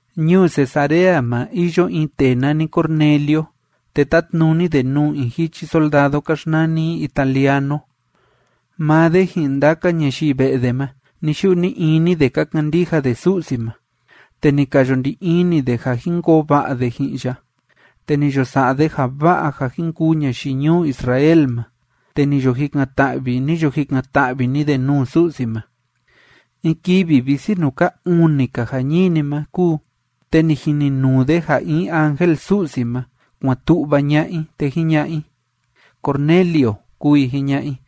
Ñuu Cesarea ma iyo in tee nani Cornelio, te tátnuni de nuu in jichi soldado ka xnani i Italiano. Maa de ji'in ndaka ñayii ve'e de ma, ni‑yu'u ni‑ini de ka kandija de Su'si ma, te ni ka yo ndi ini de ja jin koo va'a de ji'in ya. Te ni yo sa'a de ja va'a ja jin kuu ñayii ñuu Israel ma, te ni yo jikan‑ta'vi, ni yo jikan‑ta'vi‑ni de nuu Su'si ma. In kivi visi nuu ka uni‑ka jañini ma kúu, te ni jininuu de ja in ángel Su'si ma, kuan tu'va ña'a i, te jiña'a i: ―¡Cornelio! ―kúu i jiña'a i.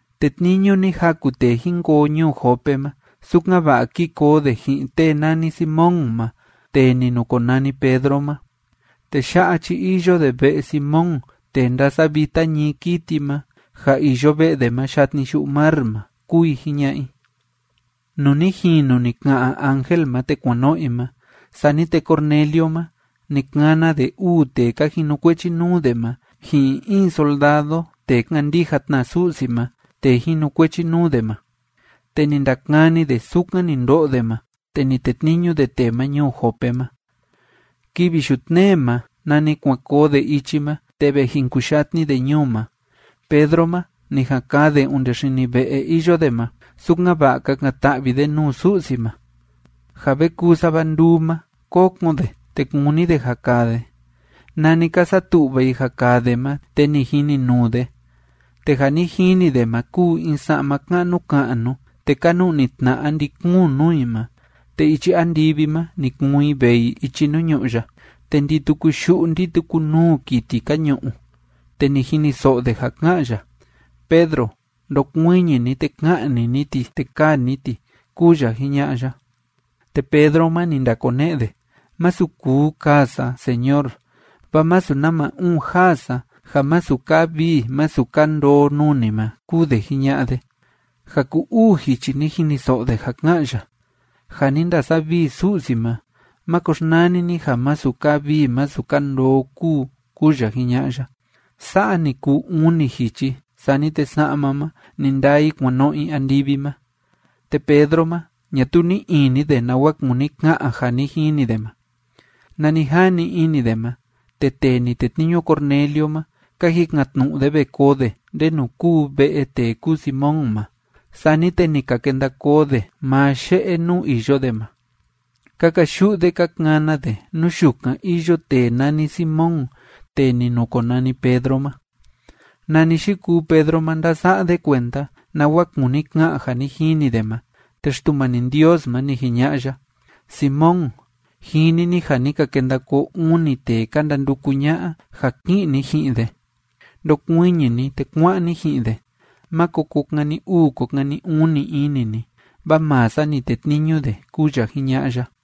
Tetniñu ni jaku tee jín koo ñuu Jope ma, sukan‑va'a kí koo de ji'in tee nani Simón ma tee ni nukonani Pedro ma. Tee ya'a chi iyo de ve'e Simón tee ndásavita ñií kiti ma, ja iyo ve'e de ma yatni yu'u mar ma ―kúu i jiña'a i. Nuu ni jinu ni ka'an ángel ma te kuan no'o i ma, sani te Cornelio ma, ni kana de uu tee ka jinukuechi nuu de ma ji'in in soldado tee kándija tna Su'si ma tee jinukuechi nuu de ma. Te ni ndakani de sukan ni ndo'o de ma, te ni tetniñu de tee ma ñuu Jope ma. Kivi yutnee ma nani kuan koo de ichi ma te ve jin kuyatni de ñuu ma, Pedro ma ni jan kaa de onde xini ve'e iyo de ma, sukan‑va'a kakan‑ta'vi de nuu Su'si ma. Ja ve kuu sava nduu ma, kókon de, te kúni de ja kaa de. Nani ka satu'va i ja kaa de ma, te ni jininuu de. Te ja ni jini de ma kúu in sa'ma ka'nu ka'nu, te ka nu'ni tna'a ndi‑kuun nuu i ma, te ichi andivi ma ni kuun i vee i ichi nuu ñu'ú ya. Te ndi‑tuku yu'u ndi‑tuku nuu kiti ka ñu'u. Te ni jiniso'o de ja ká'an ya: ―Pedro, ndokuiñi ni, te ka'ni ni ti, te kaa ni ti ―kúu ya jiña'a ya. Te Pedro ma, ni ndakone'e de: ―Masu kuu kaa sa, Señor, vaa masu nama uun jaa sa ja masu kaa vii masu kaa ndoo nuu ni ma ―kúu de jiña'a de. Ja ku‑uu jichi ni jiniso'o de ja ká'an ya: ―Ja ni ndasavii Su'si ma, máko xnani ni ja masu kaa vii masu kaa ndoo kúu ―kúu ya jiña'a ya. Sa'a ni kuu uni jichi, sani te sa'ma ma, ni ndaa i kuan no'o i andivi ma. Te Pedro ma, ñatuu ni'i ini de nawa kúni ka'an ja ni jini de ma. Nani jani ini de ma, te tee ni tetniñu Cornelio ma, ka jikan‑tnu'u de ve koo de, ndenu kúu ve'e tee kúu Simón ma. Sani te ni ka kenda koo de maa ye'e nuu iyo de ma. Ka kayu'u de ka kana de nú yukan iyo tee nani Simón tee ni nukonani Pedro ma. Nani yikuu Pedro ma ndása'a de kuenda nawa kúni ka'an ja ni jini de ma, te Xtumani Ndios ma, ni jiña'a ya: ―Simón, jini ni ja ni ka kenda koo uni tee ka ndanduku ña'a ja ki'in ni ji'in de. Ndokuiñi ni, te kuá'an ni ji'in de. Máko ko kani uu ko kani uni ini ni, vaa maa sa ni tetniñu de ―kúu ya jiña'a ya.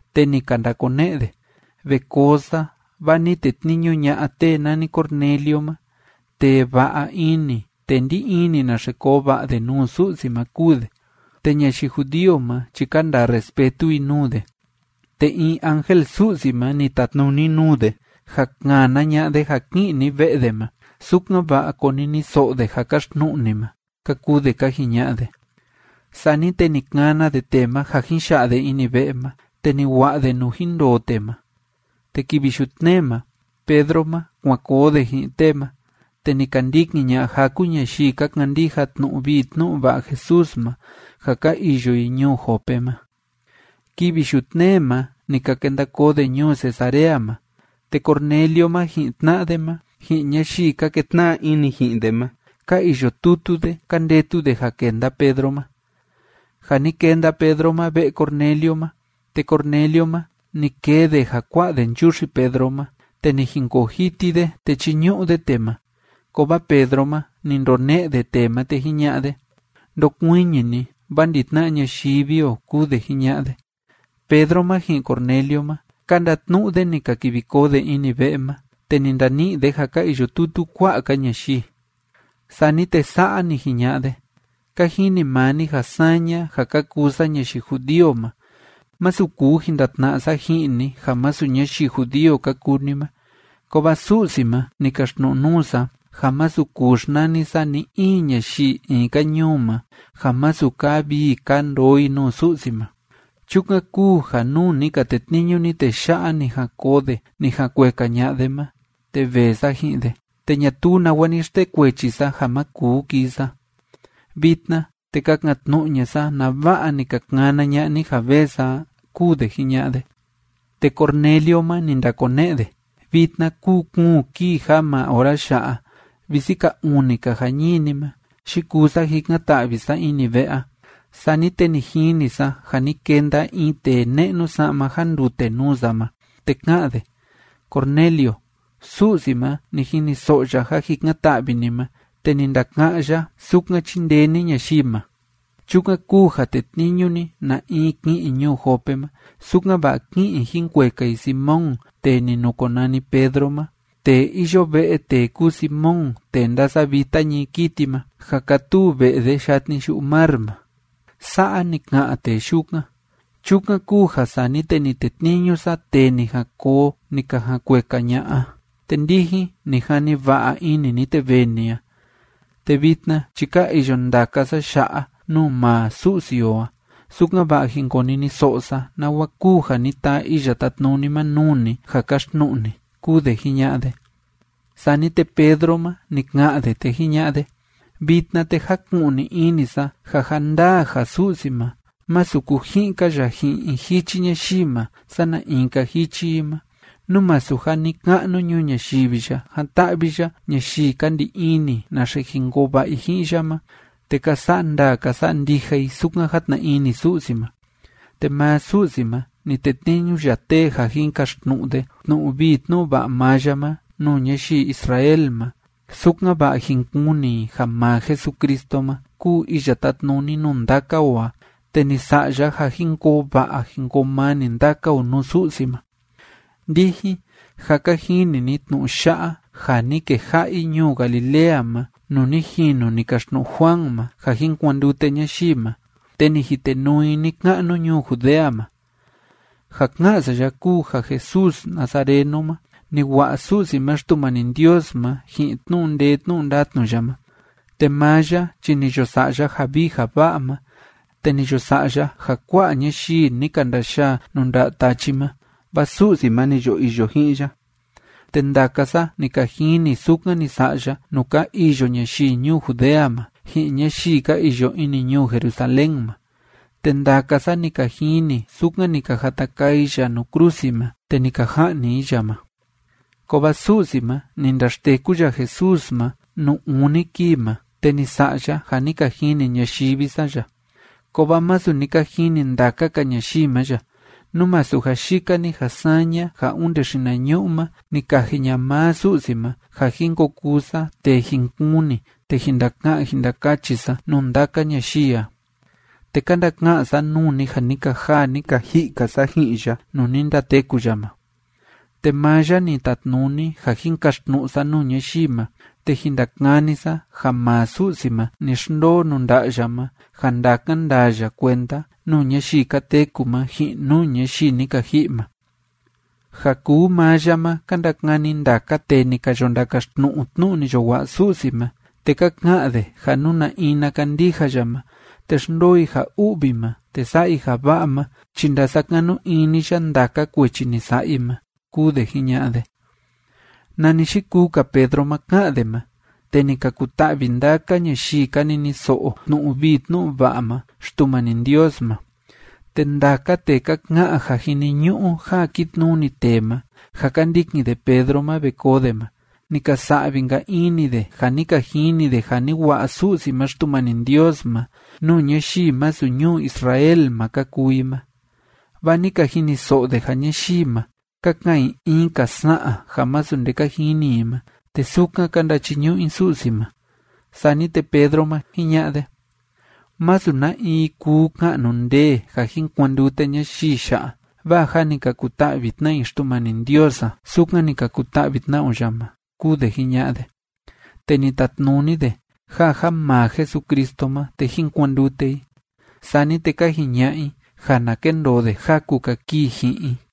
Te ni ka ndakone'e de: ―Ve koo sa, vaa ni tetniñu ña'a tee nani Cornelio ma. Tee va'a ini, tee ndí ini naxe koo va'a de nuu Su'si ma kúu de, te ñayii judío ma chi ka ndaa respetu i nuu de. Te in ángel Su'si ma ni tatnuni nuu de ja kana ña'a de ja ki'in ni ve'e de ma, sukan‑va'a koniniso'o de ja kaxtnu'u ni ma ―ka kuu de ka jiña'a de. Sani te ni kana de tee ma ja jin ya'a de ini ve'e ma, te ni wa'a de nuu jin ndoo tee ma. Te kivi yutnee ma Pedro ma, kuan koo de ji'in tee ma, te ni ka ndikin ña'a jaku ñayii ka kandija tnu'u vii tnu'u va'a Jesús ma ja ka iyo i ñuu Jope ma. Kivi yutnee ma ni ka kenda koo de ñuu Cesarea ma, te Cornelio ma, ji'in tna'a de ma, ji'in ñayii ka ketna'a ini ji'in de ma, ka iyo tutu de ka ndetu de ja kenda Pedro ma. Ja ni kenda Pedro ma ve'e Cornelio ma, te Cornelio ma, ni kee de ja kua'a de nchuxi Pedro ma, te ni jinkoo jiti de, te chíñu'u de tee ma. Kovaa Pedro ma, ni ndone'e de tee ma, te jiña'a de: ―Ndokuiñi ni, vaa ndi‑tna'a ñayivi o ―kúu de jiña'a de. Pedro ma ji'in Cornelio ma, ka ndatnu'u de ni ka kivi koo de ini ve'e ma, te ni ndani'i de ja ka iyo tutu kua'a‑ka ñayii. Sani te sa'a ni jiña'a de: ―Ka jini maa ni ja saña ja ka kuu sa ñayii judío ma, masu kuu jin ndatna'a sa ji'in ni ja masu ñayii judío ka kuu ni ma. Kovaa Su'si ma ni kaxtnu'u nuu sa ja masu kuu xnani sa ni‑in ñayii in‑ka ñuu ma ja masu kaa vii kaa ndoo i nuu Su'si ma. Chukan kúu ja nuu ni ka tetniñu ni tee ya'a ni jan koo de ni jan kueka ña'a de ma, te vee sa ji'in de, te ñatuu nawa ni xtekuechi sa ja ma kuu kii sa. Vitna, te kakan‑tnu'u ña'a sa nava'a ni ka kana ña'a ni ja vee sa a ―kúu de jiña'a de. Te Cornelio ma, ni ndakone'e de: ―Vitna kúu kuun kii ja maa ora ya'a visi ka uni‑ka jañini ma yikuu sa jikan‑ta'vi sa ini ve'e a. Sani te ni jini sa ja ni kenda in tee ne'nu sa'ma jandute nuu sa ma, te ká'an de: “Cornelio, Su'si ma, ni jiniso'o ya ja jikan‑ta'vi ni ma, te ni ndaka'án ya sukan chíndee ni ñayii ma. Chukan kúu ja tetniñu ni na in ki'in ñuu Jope ma, sukan‑va'a kí'in i jin kueka i Simón tee ni nukonani Pedro ma, tee iyo ve'e tee kúu Simón tee ndásavita ñií kiti ma, ja kátuu ve'e de yatni yu'u mar ma.” Sa'a ni ka'an tee yukan. Chukan kúu ja sani te ni tetniñu sa tee ni jan koo ni ka jan kueka ña'a a, te ndijin, ni jani va'a ini ni, te vee ni a. Te vitna chi ka iyo ndaka sa ya'a nuu maa Su'si o a, sukan‑va'a jin koniniso'o sa nawa kúu ja ni taa Iya Tátnuni ma nuu ni ja kaxtnu'u ni ―kúu de jiña'a de. Sani te Pedro ma, ni ka'an de, te jiña'a de: ―Vitna, te jáku'ni ini sa ja ja ndaa ja Su'si ma, masu kuji'in‑ka ya ji'in in jichi ñayii ma sana in‑ka jichi i ma, nú masu ja ni‑ka'nu ñuu ñayivi ya jan‑ta'vi ya ñayii ka ndi ini naxe jin koo va'a i ji'in ya ma te ka sa'a ndaa ka sa'a ndija i sukan játna ini Su'si ma. Te maa Su'si ma, ni tetniñu ya tee ja jin kaxtnu'u de tnu'u vii tnu'u va'a maa ya ma nuu ñayii Israel ma, sukan‑va'a jin kuni i ja maa Jesucristo ma kúu iya tátnuni nuu ndaka o a, te ni sa'a ya ja jin koo va'a jin koo mani ndaka o nuu Su'si ma. Ndijin, jâ ka jini ni tnu'u ya'a ja ni keja'a i ñuu Galilea ma nuu ni jinu ni kaxtnu'u Juan ma ja jin kuandute ñayii ma, te ni jitenuu i ni‑ka'nu ñuu Judea ma. Ja ká'an sa ya kúu ja Jesús nazareno ma, ni wa'a Su'si ma Xtumani Ndios ma ji'in tnu'u ndee tnu'u ndatnu ya ma. Te maa ya chi ni yo sa'a ya ja vii ja va'a ma, te ni yo sa'a ya ja kua'a ñayii ni ka ndayaa nuu nda'a tachi ma, vaa Su'si ma ni yo iyo ji'in ya. Te ndaka sa ni ka jini sukan ni sa'a ya nuu ka iyo ñayii ñuu Judea ma, ji'in ñayii ka iyo ini ñuu Jerusalén ma. Te ndaka sa ni ka jini sukan ni ka jata kaa i ya nuu krusi ma, te ni ka ja'ni i ya ma. Kovaa Su'si ma, ni ndaxteku ya Jesús ma nuu uni kii ma, te ni sa'a ya ja ni ka jini ñayivi sa ya. Kovaa masu ni ka jini ndaka‑ka ñayii ma ya, nú masu ja yika‑ni ja saña ja onde xinañu'u ma ni kaji ña'a maa Su'si ma ja jin ko kuu sa tee jin kuni te jin ndaka'an jin ndakachi sa nuu ndaka ñayii a, te ka ndaka'an sa nuu ni ja ni ka jaa, ni ka ji'i‑ka sa ji'in ya nuu ni ndateku ya ma. Te maa ya ni tatnuni ja jin kaxtnu'u sa nuu ñayii ma, te jin ndakani sa ja maa Su'si ma ni xndoo nuu nda'a ya ma ja ndakan ndaa ya kuenda nuu ñayii ka teku ma ji'in nuu ñayii ni ka ji'i ma. Ja kuu maa ya ma ka ndakani ndaka tee ni ka yo ndakaxtnu'u tnu'u ni yo wa'a Su'si ma, te ka ka'an de ja nú na in na kandija ya ma te xndoo i ja u'vi ma te sa'a i ja va'a ma chi ndasakanu ini ya ndaka kuechi ni sa'a i ma ―kúu de jiña'a de. Nani yikuu‑ka Pedro ma ká'an de ma, te ni ka kuta'vi ndaka ñayii ka niniso'o tnu'u vii tnu'u va'a ma Xtumani Ndios ma. Te ndaka tee ka ka'an ja jiniñu'u ja kitnuni tee ma, ja ka ndikin de Pedro ma ve koo de ma, ni ka sa'vi‑nka ini de ja ni ka jini de ja ni wa'a Su'si ma Xtumani Ndios ma nuu ñayii masu ñuu Israel ma ka kuu i ma, vaa ni ka jiniso'o de ja ñayii ma, ka ka'an i in‑ka sa'an ja masu nde ka jini i ma, te sukan ka ndachiñu'u i Su'si ma. Sani te Pedro ma, jiña'a de: ―Masu na in kuu ka'nu ndee ja jin kuandute ñayii ya'a. Vaa jâ ni ka kuta'vi tna i Xtumani Ndios a, sukan ni ka kuta'vi tna o ya ma ―kúu de jiña'a de. Te ni tatnuni de ja ja maa Jesucristo ma, te jín kuandute i. Sani te ka jiña'a i ja na kendoo de jaku‑ka kii ji'in i.